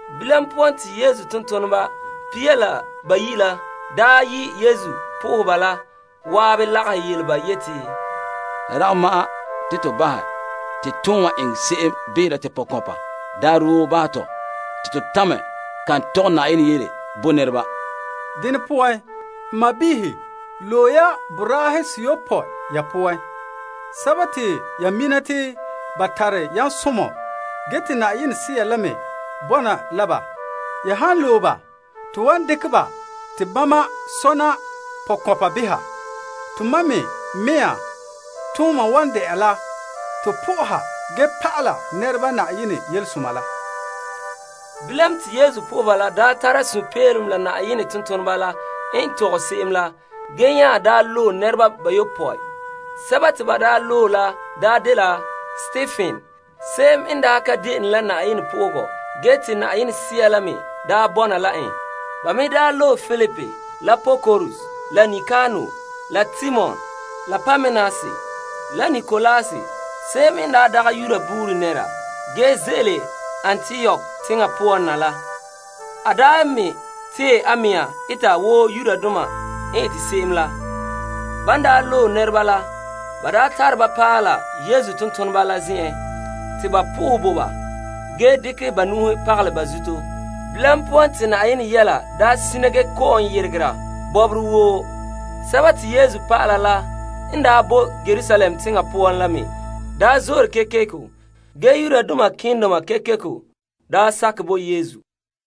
Bilam poan te Yesu tontoneba pia la bayi' la yi' lagaŋɔ la zan'an lagahɛ yele ba yeti, La dagɛ ma'an te to bahɛ te ton wan eŋɛ se'em behera te pɔkɔnpa daarɛ woo bahɛ tɔ te to tamɛ kan tɔgɛ Yenɛ yele bo nɛreba. Dene poan n sɔɔnrɔ loe ya boraahe seyopɔe ya poan, sɛba te ya mina te ba tare yamsomɔ ge te Yenɛ Sea la me bɔna la ba. Ya han loe ba bahɛ te wan dekɛ ba te bama sɔna pɔkɔnpa behera. Tomam mea me tooma wan de'a la to sohɛ ge pa'ala nɛreba Yenɛ Yelesoma la. Bilam te lagaŋɔ la daa tara sunpeelom la Yenɛ tontoneba la n tɔgɛ se'em la ge nya loe nɛreba bayopɔe. Sɛba te ba loe la dela Stepen se'em n daa ka de'ene la Yenɛ sohoga ge te Yenɛ Sea la me daa bɔna la en. Ba me loe Filip la Prokorus la Nikanor la Timon la Parmenas la Nikolaus se'em n dagɛ Yuda buuri nɛra ge ze'ele Antiok teŋa poan na la. A me tee a mea eta wo Yudoma n ete se'em la. Ban daa loe nɛreba la, ba tare ba paɛ la Yesu tontoneba la zen'en te ba sohɛ bo ba ge dekɛ ba nu'uhen pagalɛ ba zuto. Bilam poan te Yenɛ yɛla sina ge kɔ'ɔn yeregera bɔbɔre woo. Te Yesu dɔlɔba la n boe Yerusalem teŋa poan la me zo'ore kekeko, kekeko ge malema keendoma kekeko me sakɛ bo Yesu.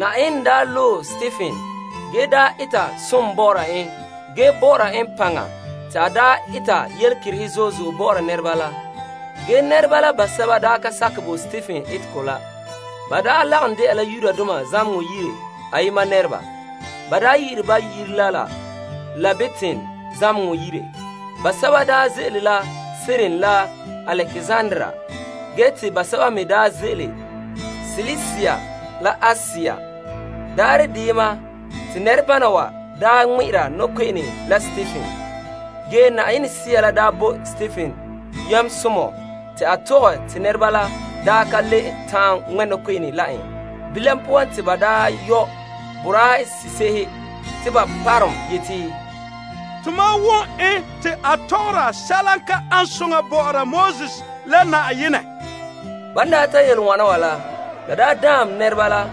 Yenɛ daa loe Stepen ge eta som bɔ'ɔra en ge bɔ'ɔra en paŋa te a eta yelekerehe zo'e zo'e bɔ'ɔra nɛreba la. Ge nɛreba basɛba ka sakɛ bo Stepen etegɔ la. Ba lagom de'a la Zamehegɔ yire se'ere te ba yi'ire Fai tɛn'ɛhegɔ doma. Basɛba ze'ele la Kirene la Alekzandria na. Ge te basɛba me ze'ele Silisia la Asia. Daarɛ deyema te nɛrebana wa ŋmɛ'ɛra nɔkpe'ene la Stepen. Ge Yenɛ Sea la bo Stepen yamsomɔ te a tɔgɛ te nɛreba la ka le ta'an ŋmɛ' nɔkpe'ene la en. Bilam poan te ba yɔ' boraa se'ehe te ba parom yeti, Tomam wom en te a tɔgɔra sɛla n ka ane soŋa bɔ'ɔra Moses la Yenɛ. Ban ta yele wana wa la, la daam nɛreba la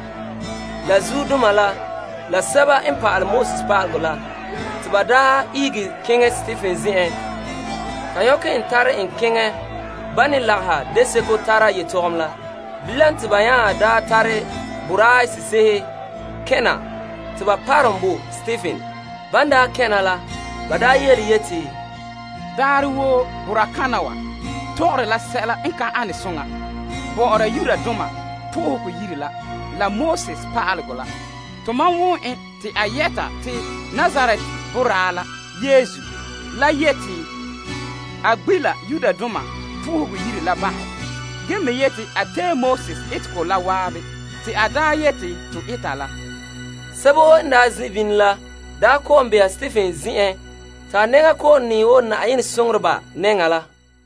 zuodoma la sɛba n pa'alɛ Pa'alegɔ la. Te ba ihege keŋɛ Stepen zen'en ta nyɔkɛ en tare en keŋɛ Yetɔgom Tɔgɔrɔba la nɛŋan. Bilam te ba nya tare boraa se'ehe kɛn' na te ba parom bo Stepen. Ban kɛn' na la, ba yeti, Daarɛ woo boraa kana wa tɔgɔre la sɛla ka an soŋa bɔ'ɔra toolom zen'an la pa'alegɔ la. Tomam wom en te a yɛta te Nazaret boraa la Yesu la yeti a gbi' la Yenɛ Yire la bahɛ ge me yete a tee Moses malema la. Yetɔgom Tɔgɔrɔba woo n zin' bini la kɔ'ɔn beha Stepen zen'en te a nɛŋa kɔ'ɔn nɛɛ wo Yenɛ soŋoreba nɛŋa la.